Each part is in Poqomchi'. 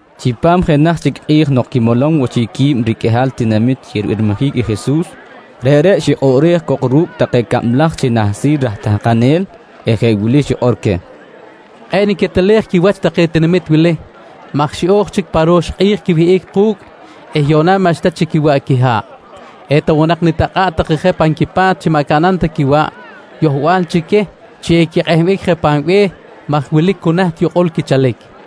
Chipam jenaj chic i kꞌi̱j nok quimolom woꞌ chic qui̱b riqꞌuihal tinamit chi ribirmijic i Jesus, reꞌreꞌ xikꞌoꞌrej cok ru̱cꞌ take cablaj chi nahsil raj tahkanel ru̱cꞌ eh jeꞌ wili xikꞌor queh: «Kꞌe̱ꞌ niquetelej quiwach take tinamit wili maj xiꞌo̱j chic pa ro̱x kꞌi̱j quiwihꞌic ku̱cꞌ eh yuꞌna maꞌxta chic quiwaꞌ quiha̱ꞌ. Eta woꞌ nak nitakꞌa̱ꞌ take je pan quipa̱t chi maꞌ caꞌnam ta quiwaꞌ yohbal chi queh chi equikꞌehbic je pan be̱h maj wilic cu naht yukꞌul quichalic, nqui queh.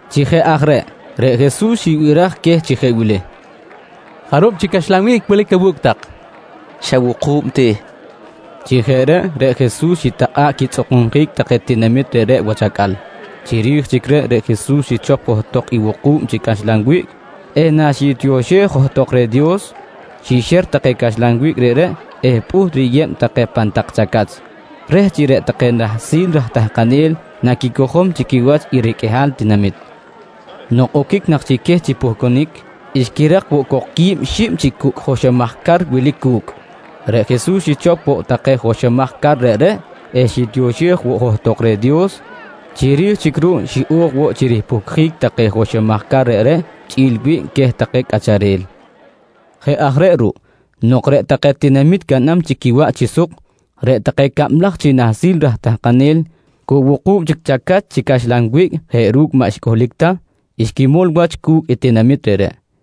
Chi jeꞌ aj reꞌ, reꞌ Jesus xibiraj queh chi jeꞌ wili: «Jarub chi caxlan wiꞌc wilic awu̱cꞌ tak? nqui queh. —Xa wuku̱b ti, nqui take reh. Chi jeꞌ reꞌ, reꞌ Jesus xitakꞌa̱ꞌ quitzꞌukunjic take tinamit reꞌreꞌ wach acꞌal. Chiri̱j chic reꞌ Jesus xichop johtok i wuku̱b chi caxlan wiꞌc eh naxitioxej johtok reh i Dios, xixer take caxlan wiꞌc reꞌreꞌ eh pꞌuht riyeb take pan tak chacach, reh chi reꞌ take nahsil raj tahkanel naquicojom chi quiwach i riqꞌuihal tinamit. Nok oquic nak chic queh chi puhcunic, xquirak woꞌ cok qui̱b xib chi cucꞌ joxomaj car wilic cu̱cꞌ. Reꞌ Jesus xichop woꞌ take joxomaj car reꞌreꞌ eh xitioxej woꞌ johtok reh Dios. Chiri̱j chic ruꞌ xiꞌo̱j woꞌ chi ripuhcjic take joxomaj car reꞌreꞌ chꞌi̱l i wiꞌc queh take cꞌacharel. Jeꞌ aj reꞌ ruꞌ, nok reꞌ take tinamit caꞌnam chic quiwaꞌ chi suk, reꞌ take cablaj chi nahsil raj tahkanel cu wuku̱b chic chacach chi caxlan wiꞌc jeꞌ ru̱cꞌ maꞌ xcꞌuhlic ta, xquimol wach cu̱cꞌ tinamit reꞌreꞌ.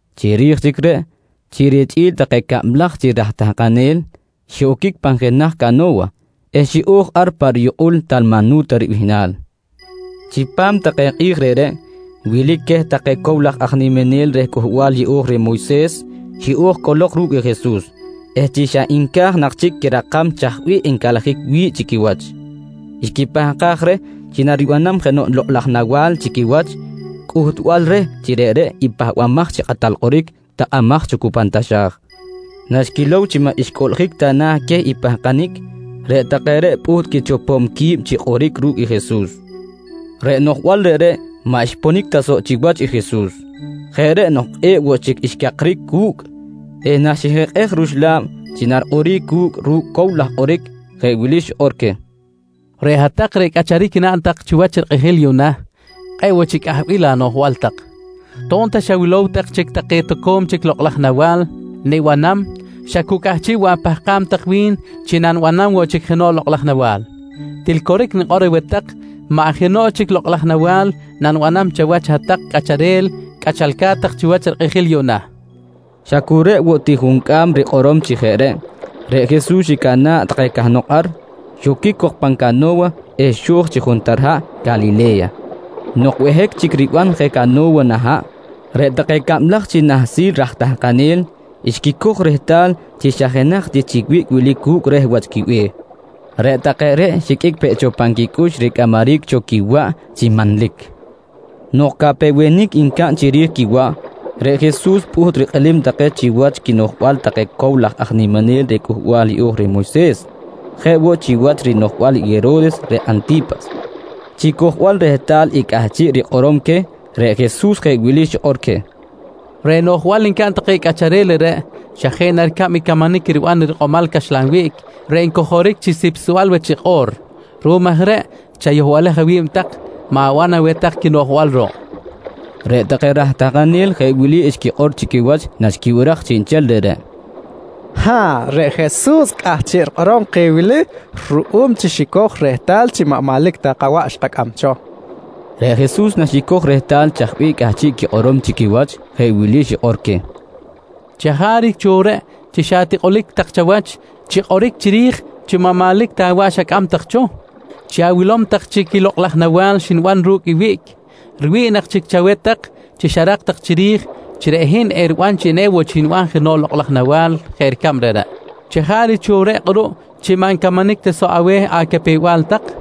Chiri̱j chic reꞌ, chi richꞌi̱l take cablaj chi raj tahkanel xiꞌoquic pan jenaj cano̱wa eh xiꞌo̱j ar pa riyukꞌul Talmanu̱ta ribihnal. Chipam take kꞌi̱j reꞌreꞌ, wilic queh take cow laj aj niminel reh Cꞌuhbal Yeꞌo̱j reh Moyses xiꞌo̱j cꞌolok ru̱cꞌ i Jesus eh chi xa nca̱j nak chic quirakam chaj bih encalajic wi̱ꞌ chi quiwach, xquipahkaj reh chi naribanam jenoꞌ lokꞌ laj nawa̱l chi quiwach cꞌuhtbal reh chi reꞌreꞌ i Pahbamaj chi Kꞌatal Kꞌoric takꞌamaj cho cu pan taxa̱j. Naxquilow chi maꞌ xcꞌuꞌljic ta na̱ queh i pahkanic, reꞌ take reꞌ pꞌuht quichopom qui̱b chi kꞌoric ru̱cꞌ i Jesus. Reꞌ noꞌjbal reꞌreꞌ maꞌ xponic ta soꞌ chiwach i Jesus. Jeꞌ reꞌ nok kꞌe̱ꞌ woꞌ chic xcakric cu̱cꞌ eh naxijikꞌej ruxla̱b chi narikꞌoric cu̱cꞌ ru̱cꞌ cow laj kꞌoric, jeꞌ wili xikꞌor queh: «Reꞌ hat-tak reꞌ cꞌacharic naꞌn tak chiwach rikꞌijil yuꞌna, kꞌe̱ꞌ woꞌ chic cꞌahbil anoꞌjbal tak. To̱b ta xawilow tak chic take toco̱m chic lokꞌ laj nawa̱l nibanam xa cu cꞌahchiꞌ woꞌ apahkam tak wi̱n chi nanibanam chic jenoꞌ lokꞌ laj nawa̱l. Til coric nikꞌor aweh tak, maꞌ jenoꞌ chic lokꞌ laj nawa̱l nanibanam chawach hat-tak cꞌacharel cꞌachalca̱t tak chiwach rikꞌijil yuꞌna, nqui queh. Xa cu reꞌ woꞌ ti juncꞌam rikꞌorom chi jeꞌ reꞌ, reꞌ Jesus xicana̱ꞌ take cahnok ar, xoquic cok pan cano̱wa eh xo̱j chi juntar haꞌ Calile̱ya. Nok behic chic riban je cano̱wa nah haꞌ, reꞌ take cablaj chi nahsil aj tahkanel xquicoj rehtal chi xa jenaj ti chi wiꞌc wilic cu̱cꞌ reh wach quibe̱h. Reꞌ take reꞌ xiqꞌuic peꞌ cho pan quicꞌux ricꞌamaric cho i quiwaꞌ chi manlic! Nok capewenic ncaꞌn chiri̱j quiwaꞌ, reꞌ Jesus pꞌuht rikꞌilim take chiwach quinoꞌjbal take cow laj aj niminel reh Cꞌuhbal Yeꞌo̱j reh Moyses, jeꞌ woꞌ chiwach i rinoꞌjbal i Hero̱res reꞌ Anti̱pas. Chi cojbal rehtal i cꞌahchiꞌ rikꞌorom queh, reꞌ Jesus jeꞌ wili xikꞌor queh: «Reꞌ noꞌjbal ncaꞌn take cꞌacharel reꞌreꞌ xa jeꞌ na ricab i camanic riban i rikꞌomal caxlan wiꞌc reꞌ ncojoric chi sipsbal wach i kꞌo̱r. Ruꞌum aj reꞌ chayohbalej awi̱b tak, ma̱ban aweh tak i quinoꞌjbal ruꞌ, nqui queh. Reꞌ take raj tahkanel jeꞌ wili xquikꞌor chi quiwach naxquibiraj chiꞌnchel reꞌreꞌ: «Ha̱ꞌ, reꞌ Jesus cꞌahchiꞌ rikꞌorom keh wili ruꞌum chi xicoj rehtal chi maꞌ manlic ta kawaꞌ xkacꞌam cho, nqui take. Reꞌ Jesus naxicoj rehtal chaj bih cꞌahchiꞌ quikꞌorom chi quiwach jeꞌ wili xikꞌor queh: «Chajaric cho reꞌ chi xatikꞌulic tak chawach chi kꞌoric chiri̱j chi maꞌ manlic ta awaꞌ tak xacꞌam cho? Chi awilow tak chic i lokꞌ laj nawa̱l xniban ru̱cꞌ i wiꞌc, riwi̱ꞌ nak chic chaweh tak chi xarak tak chiri̱j chi reꞌ hin eriban chi eniban jenoꞌ chic lokꞌ laj nawa̱l jeꞌ ricab reꞌreꞌ. Chajaric cho reꞌ kꞌuruꞌ chi maꞌ ncamanic ta soꞌ aweh acapew-bal tak?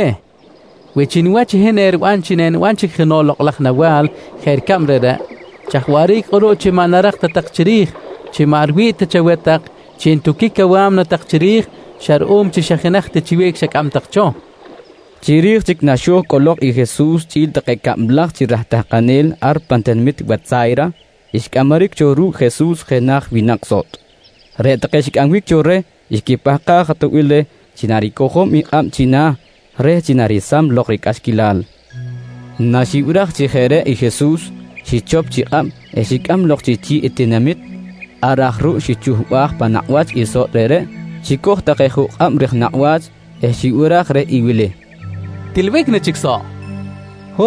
—Coric aweh! Wi chi niwach i hin eriban chi eniban chic jenoꞌ lokꞌ laj nawa̱l jeꞌ ricab reꞌreꞌ, chaj waꞌric kꞌuruꞌ chi maꞌ narak ta tak chiri̱j chi maꞌ riwi̱ꞌ ta chaweh tak chi ntuquic awa̱mna tak chiri̱j xa ruꞌum chi xa jenaj ti chi wiꞌc xacꞌam tak cho? nqui Jesus queh. Chiri̱j chic naxo̱j cꞌolok i Jesus chꞌi̱l take cablaj chi raj tahkanel ar pan tinamit Wetsa̱yra, xcꞌamaric cho ru̱cꞌ Jesus jenaj winak sotꞌ. Reꞌ take xicꞌambic cho reh xquipahkaj atoꞌbil reh chi naricojom i kꞌab china̱ reh chi naresam lok ricꞌaxquilal. Naxibiraj chi jeꞌ reꞌ i Jesus, xichop chi kꞌab eh xicꞌam lok chi chi̱ꞌ i tinamit. Ar aj ruꞌ xichuhbaj pan nakꞌ wach i sotꞌ reꞌreꞌ, xicoj take juꞌ kꞌab rij nakꞌ wach eh xibiraj reh i wili: «Tilbic na chic soꞌ? nqui reh.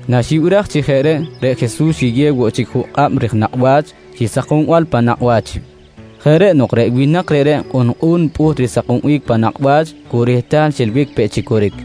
Naxibiraj chi jeꞌ reꞌ, reꞌ Jesus xiyew woꞌ chic juꞌ kꞌab ri̱j nakꞌ wach chi sakombal pan nakꞌ wach. Jeꞌ reꞌ nok reꞌ winak reꞌreꞌ kꞌunkꞌu̱n pꞌuht risakombic pan nakꞌ wach cu rehtal xilbic peꞌ chi coric.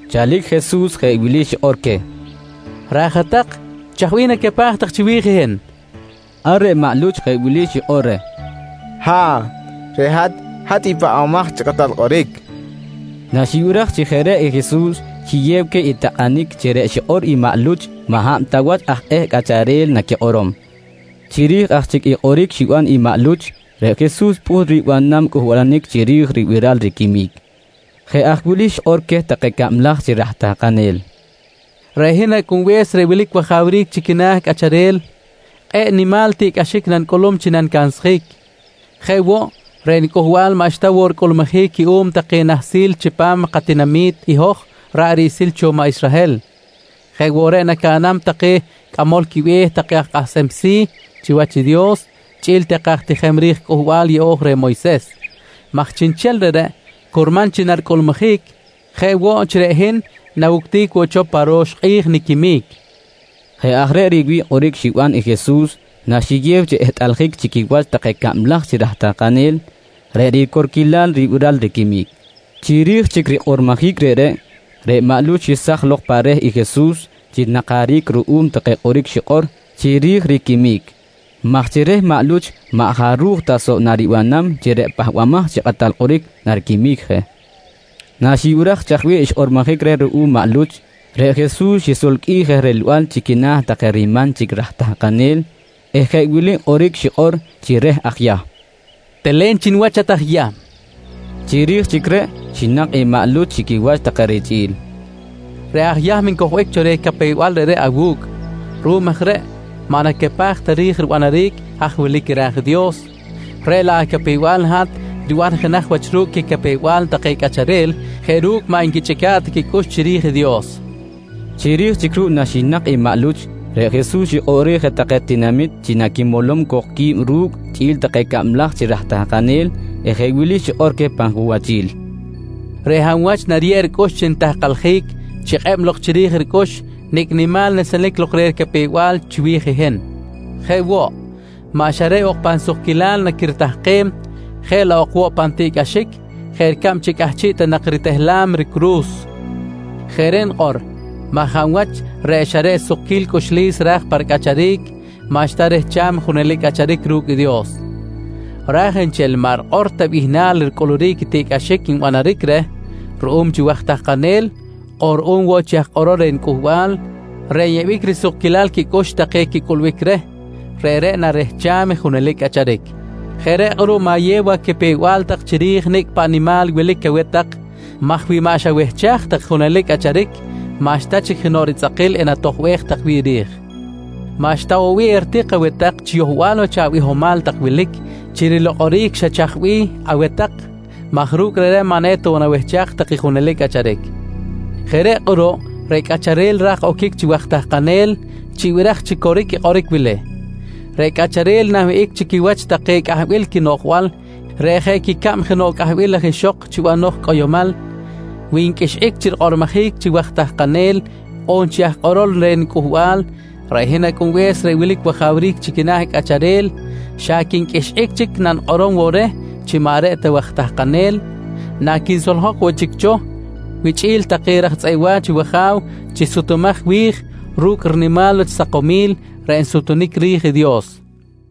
Chalic Jesus jeꞌ wili xikꞌor queh: «Raj hat-tak, chaj bih nacapaj tak chiwi̱j i hin? nqui queh. Ar reꞌ maꞌ Luch jeꞌ wili xikꞌor reh: «Ha̱ꞌ, reꞌ hat, hat i Pahbamaj chi Kꞌatal Kꞌoric, nqui reh. Naxibiraj chi jeꞌ reꞌ i Jesus xiyew queh i takꞌanic chi reꞌ xikꞌor i maꞌ Luch maꞌ hab ta wach aj eh cꞌacharel naquikꞌorom. Chiri̱j aj chic i kꞌoric xiban i maꞌ Luch, reꞌ Jesus pꞌuht ribanam cꞌuhbalanic chiri̱j ribiral i riquimic. Jeꞌ aj wili xikꞌor queh take cablaj chi raj tahkanel: «Reꞌ hin Acꞌunbe̱s reꞌ wilic wajawric chi quina̱ cꞌacharel kꞌe̱ꞌ nimal tiꞌcꞌaxic nanicꞌulum nanicansjic. Jeꞌ woꞌ, reꞌ niCꞌuhbal maꞌxta woꞌ ricꞌulmujic cuꞌum take nahsil chipam katinami̱t i hoj ra̱ꞌ riꞌsil cho maꞌ Israhel. Jeꞌ woꞌ reꞌ nacaꞌnam take cꞌamol quibe̱h take aj kꞌahsem si̱ chiwach i Dios chꞌi̱l take aj tijem ri̱j Cꞌuhbal Yeꞌo̱j reh Moyses maj chiꞌnchel reꞌreꞌ curman chi naricꞌulmujic, jeꞌ woꞌ chi reꞌ hin nawuctic woꞌ cho pa ro̱x kꞌi̱j niquimic, nqui Jesus. Jeꞌ aj reꞌ riwi̱ꞌ kꞌoric xiban i Jesus naxiyew chi ehtꞌaljic chi quiwach take cablaj chi raj tahkanel, reꞌ ricorquilal ribiral riquimic. Chiri̱j chic rikꞌormojic reꞌreꞌ, reꞌ maꞌ Luch xesaj lok pa reh i Jesus chi rinakaric ruꞌum take kꞌoric xikꞌor chiri̱j riquimic maj chi reh maꞌ Luch maꞌ jaruj ta soꞌ naribanam chi reꞌ Pahbamaj chi Kꞌatal Kꞌoric nariquimic je. Naxibiraj chaj bih xkꞌormojic reh ruꞌum maꞌ Luch, reꞌ Jesus xisolqꞌuij je rilbal chi quina̱ take riman chic raj tahkanel eh jeꞌ wili kꞌoric xikꞌor chi reh aj Yahm: «Telen chi niwach hat aj Yahm, nqui xikꞌor. Chiri̱j chic reꞌ xinak i maꞌ Luch chi quiwach take richꞌi̱l: «Reꞌ aj Yahm ncojbic cho reh capew-bal reꞌreꞌ awu̱cꞌ. Ruꞌum aj reꞌ maꞌ nacapaj ta ri̱j ribanaric haj wilic ra̱j i Dios, reꞌ laꞌ acapew-bal i hat riban jenaj wach ru̱cꞌ quicapew-bal take cꞌacharel jeꞌ ru̱cꞌ maꞌ nquichꞌica̱ꞌ ta quicꞌux chiri̱j i Dios, nqui Jesus reh. Chiri̱j chic ruꞌ naxinak i maꞌ Luch, reꞌ Jesus xikꞌoꞌrej je take tinamit chi naquimolom cok qui̱b ru̱cꞌ chꞌi̱l take cablaj chi raj tahkanel eh jeꞌ wili xikꞌor queh pan junwachil: «Reꞌ hab wach nariyeb ricꞌux chi nitahkaljic chikꞌeb lok chiri̱j ricꞌux nicꞌ nimal nesenic lok reh ricapew-bal chiwi̱j i hin. Jeꞌ woꞌ, maꞌ xa reꞌ ok pan sukquilal naquiritahkem, jeꞌ laꞌ ok woꞌ pan tiꞌcꞌaxic jeꞌ ricab chi cꞌahchiꞌ ta nak ritehlam ricuru̱s. Jeꞌ reꞌ nikꞌor maj hab wach reꞌ xa reꞌ sukquil cꞌuxlis ra̱j pa ricꞌacharic, maꞌxta rehcham i junelic cꞌacharic ru̱cꞌ i Dios, raj nchel i maꞌ rikꞌor ta bihnal ricꞌuluric i tiꞌcꞌaxic nbanaric reh ruꞌum chi waj tahkanel on ruꞌum woꞌ chi aj kꞌorol reh niCꞌuhbal reꞌ nyeꞌbic risukquilal quicꞌux take quicꞌulbic reh, reꞌreꞌ narehcham i junelic cꞌacharic. Jeꞌ reꞌ kꞌuruꞌ ma̱yew acapew-bal tak chiri̱j i nicꞌ paꞌ nimal wilic aweh tak maj wi maꞌ xawehchaj tak i junelic cꞌacharic maꞌxta chic jenoꞌ ritzꞌakil enatojbej tak wi̱ꞌ ri̱j. Maꞌxta woꞌ bih eritik aweh tak chi yohbal wach abihomal tak wilic chi rilokꞌoric xa chaj bih aweh tak maj ru̱cꞌ reꞌreꞌ maꞌ eta woꞌ nawehchaj tak i junelic cꞌacharic. Jeꞌ reꞌ kꞌuruꞌ reꞌ cꞌacharel ra̱j oquic chi waj tahkanel, chibiraj chi coric i kꞌoric wili: Reꞌ cꞌacharel nanwihꞌic chi quiwach take cꞌahbil quinoꞌjbal reꞌ jeꞌ quicab jenoꞌ cꞌahbil laj ixok chi banoj cꞌoyomal, wi nqꞌuixꞌic chi rikꞌormojic chi waj tahkanel on chi aj kꞌorol reh niCꞌuhbal, reꞌ hin Acꞌunbe̱s reꞌ wilic wajawric chi quina̱ cꞌacharel xa quinqꞌuixꞌic chic nanikꞌorom woꞌ reh chi maꞌ reꞌ ta waj tahkanel naquinsoljok woꞌ chic cho wichꞌi̱l take raj tzꞌeꞌ wa̱ch i wAja̱w chi sutumaj wi̱j ru̱cꞌ rinimal wach sakomil reꞌ nsutunic ri̱j i Dios, nqui i Jesus.